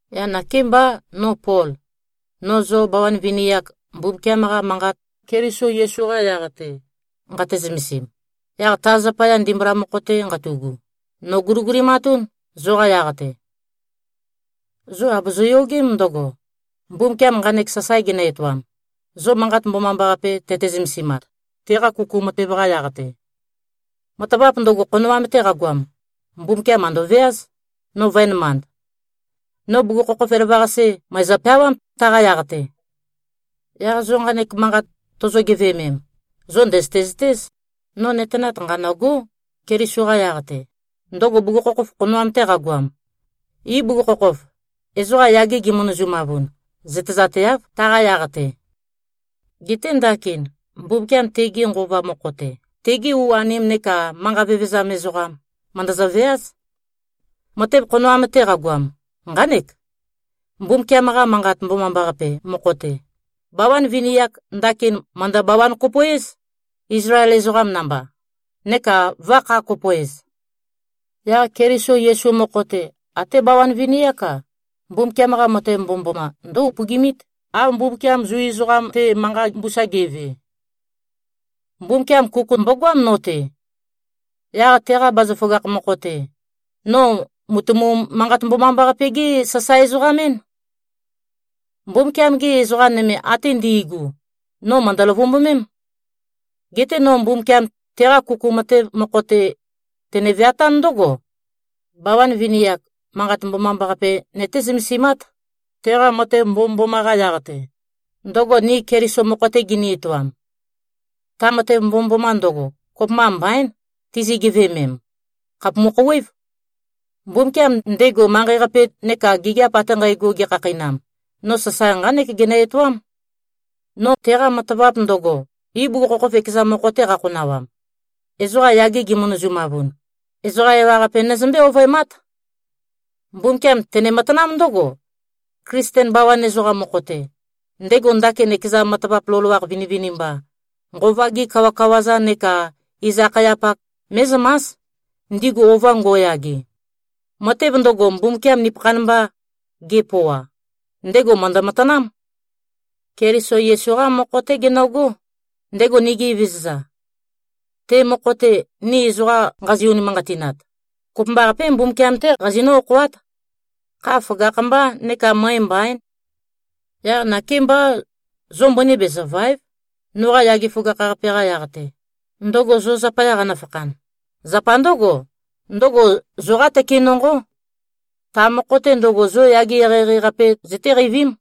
Yaq nakémbá, no Pol, no zo bawan vini-ak, Mbumbukiam-qa Manqat Keliso Yesu-qa yaq-te nqate-zømesim, yaq ta zapaya ndimbula mokho-te nqatu꞉gu, nòguligulimatún, zoqa yaq-te. Zo àbozo-yogém ndøgo, Mbumbukiam nqanek sasae genø-etoam, zo Manqat Mbomambaqape tøte-zømesimat, teqa kuku matev-qa yaq-te. Matavap ndøgo, khonoam-te qagoam, Mbumbukiam mø̀ndøveáz, no vø̄enømand. No bugukhokhof elavøqase mø̀ezø-peawám, taqa yaq-te. Yaq zo nqanek manqat tozo-geveømem, zo ndø̀zøte-zøtéz, no nøtenat nqanø̂gó, Keliso-qa yaq-te, ndøgo bugukhokhof khonoam-te qagoam. Ibugukhokhof, ezoqa yage gimønøzumavun, zøtezateáv, taqa yaq-te. Geté ndakin, Mbumbukiam tege Nqova mokho-te, tegi u-anim neka manqa vevezam ezoqam, mø̀ndøzø-veáz. Matev, khonoam-te qagoam, nqánek: Mbumbukiam-qa Manqat Mbomambaqape mokho-te, bawan vini-ak, ndakin mø̀ndø-bawan-kopo-éz, Izlael ezoqam namba, neka vø̄-kha-kopo-ez. Yaq Keliso Yesu mokho-te, até bawan vini-ák-a, Mbumbukiam-qa matev mbomømboma ndǿ-upøgimít, av Mbumbukiam Zu ezoqam-te manqa mbusa ge꞉ve. Mbumbukiam kuku mbogoám no-te. Yaq teqa bazaføgakh mokho-te, no mùtumu-Manqat-Mbomambaqape-gé-sasae-ezoqam-én. Mbumbukiam-gi ezoqa nøme ate ndi꞉gu, no mø̀ndø-løvumbumím. Geté no Mbumbukiam teqa kuku matev mokho-te, tene-veatán ndǿgo: Bawan vini-ak, Manqat Mbomambaqape nøté-zømesimát, teqa matev mbomømboma-qa yaq-te, ndøgo ni Keliso mokho-te gini-etoam. Ta matev mbomømboma ndøgo, kopømba mbaín tizi-geveømem. Khàpumu-khouwév. Mbumbukiam, ndego manqei-qape neka gigiap ate nqægo gekhakheinam, no sasae nqánek genø-etoám: No teqa matavap ndøgo, ibugukhokhof ekeza mokho-te qakhonawam, ezoqa yage gimønøzumavun, ezoqa ewaqape nøzømbé-ovøemát. Mbumbukiam tene-matanám ndǿgo: Klisten bawan ezoqam mokho-te, ndego ndakin ekeza matavap loloakh vinivinimba, nqova-gi kawakawa-za neka iz-akhayapak mé꞉zømás, ndigu ova ngo꞉yage. Matev ndøgo, Mbumbukiam nupøkhan mba gepøoa, ndego mø̀ndø-matanám. Keliso Yesu-qá mokho-té genøgó, ndego nigi Evezøza. Te mokho-te, ni ezoqa nqazi-unimanqatinat, kopømbaqapé, Mbumbukiam-té qazinǿ-okhoát. Kha føgakh-mbá neka møe mbaín. Yaq nakémbá, zo mbøni bezø̀va᷄ev, noqa yage føgakh-qape-qa yaq-te, ndøgo zo zapaya qanøfakhan. Zapa ndǿgo, ndøgo zoqá tøke nonqó. Ta mokho-te ndøgo, zo yage eqeieqei-qape zøtéqeivím.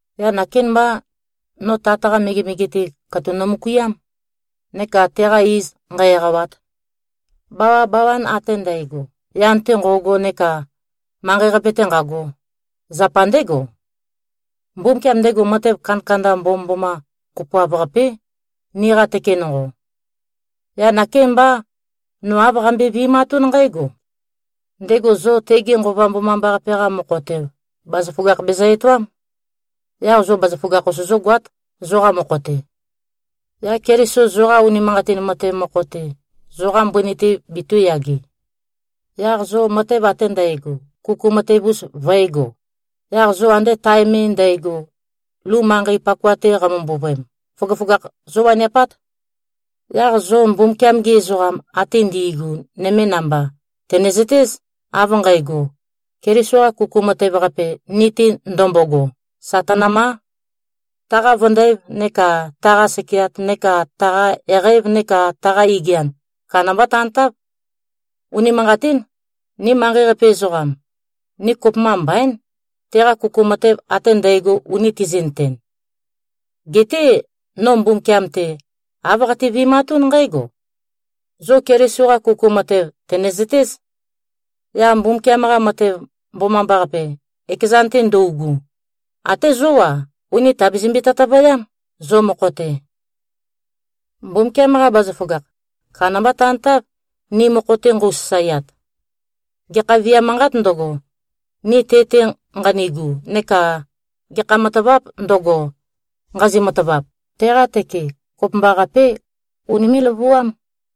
Yaq nakémbá, no Tat-qa megemege-te, katuk nomøkuiám, neka teqa iz nqǣ-ēqāwāt. Bawabawan ate ndægo, yan-te nqo꞉go neka manqei-qape-te nqago, zapa ndégo. Mbumbukiam, ndego matev kandakanda mbomømboma kopoav-qapé, niqa tøke nonqo. Yaq nakémbá, no āv qambøe-vi꞉matún nqǽgo: Ndego zo tege Nqova Mbomambaqape-qa mokho-te, bazaføgakh bezø-etoám. Yaq zo bazaføgakh-us zógoát, zoqa mokho-te. Yaq Keliso, zoqa unimanqatin matev mokho-te, zoqa mbøni-te betū꞉yage. Yaq zo matev ate ndægo, kuku matev-us vø̄ego. Yaq zo ande tae me ndægo, lu manqei pakoa-te qamø-mbuvøem, føgøføgakh zówaniapát. Yaq zo Mbumbukiam-gi ezoqam ate ndi꞉gu nøme namba, tø̀nezøtéz, av nqægo: Keliso-qa kuku matev-qape, ni-te ndømbogo, sà tønømá. Taqa vøndæv neka taqa sekeat neka taqa eqæv neka taqa igian, kandambá tantáv. Unimanqatín. Ni manqei-qape ezoqam, ni kopømba mbaín, teqa kuku matev ate ndægo uni tizi꞉nøten. Geté no Mbumbukiam-te, āv qate-vi꞉matún nqǽgo: Zo Keliso-qa kuku matev tø̀nezøtéz. Yaq Mbumbukiam-qa matev mbomambaqape, ekezan-te ndøugu, até zó-a, ùni tabezømbe-tøtøvøyám, zo mokho-te. Mbumbukiam-qa bazaføgakh, kandamba tantáv, ni mokho-te nqøu-sasaeat. Gekha viam manqāt ndøgo, ni te-te nqanigu, neka gekha matavāp ndøgo, nqazi-matavap, teqa tøke kopømbaqapé, unimé꞉-løvuám.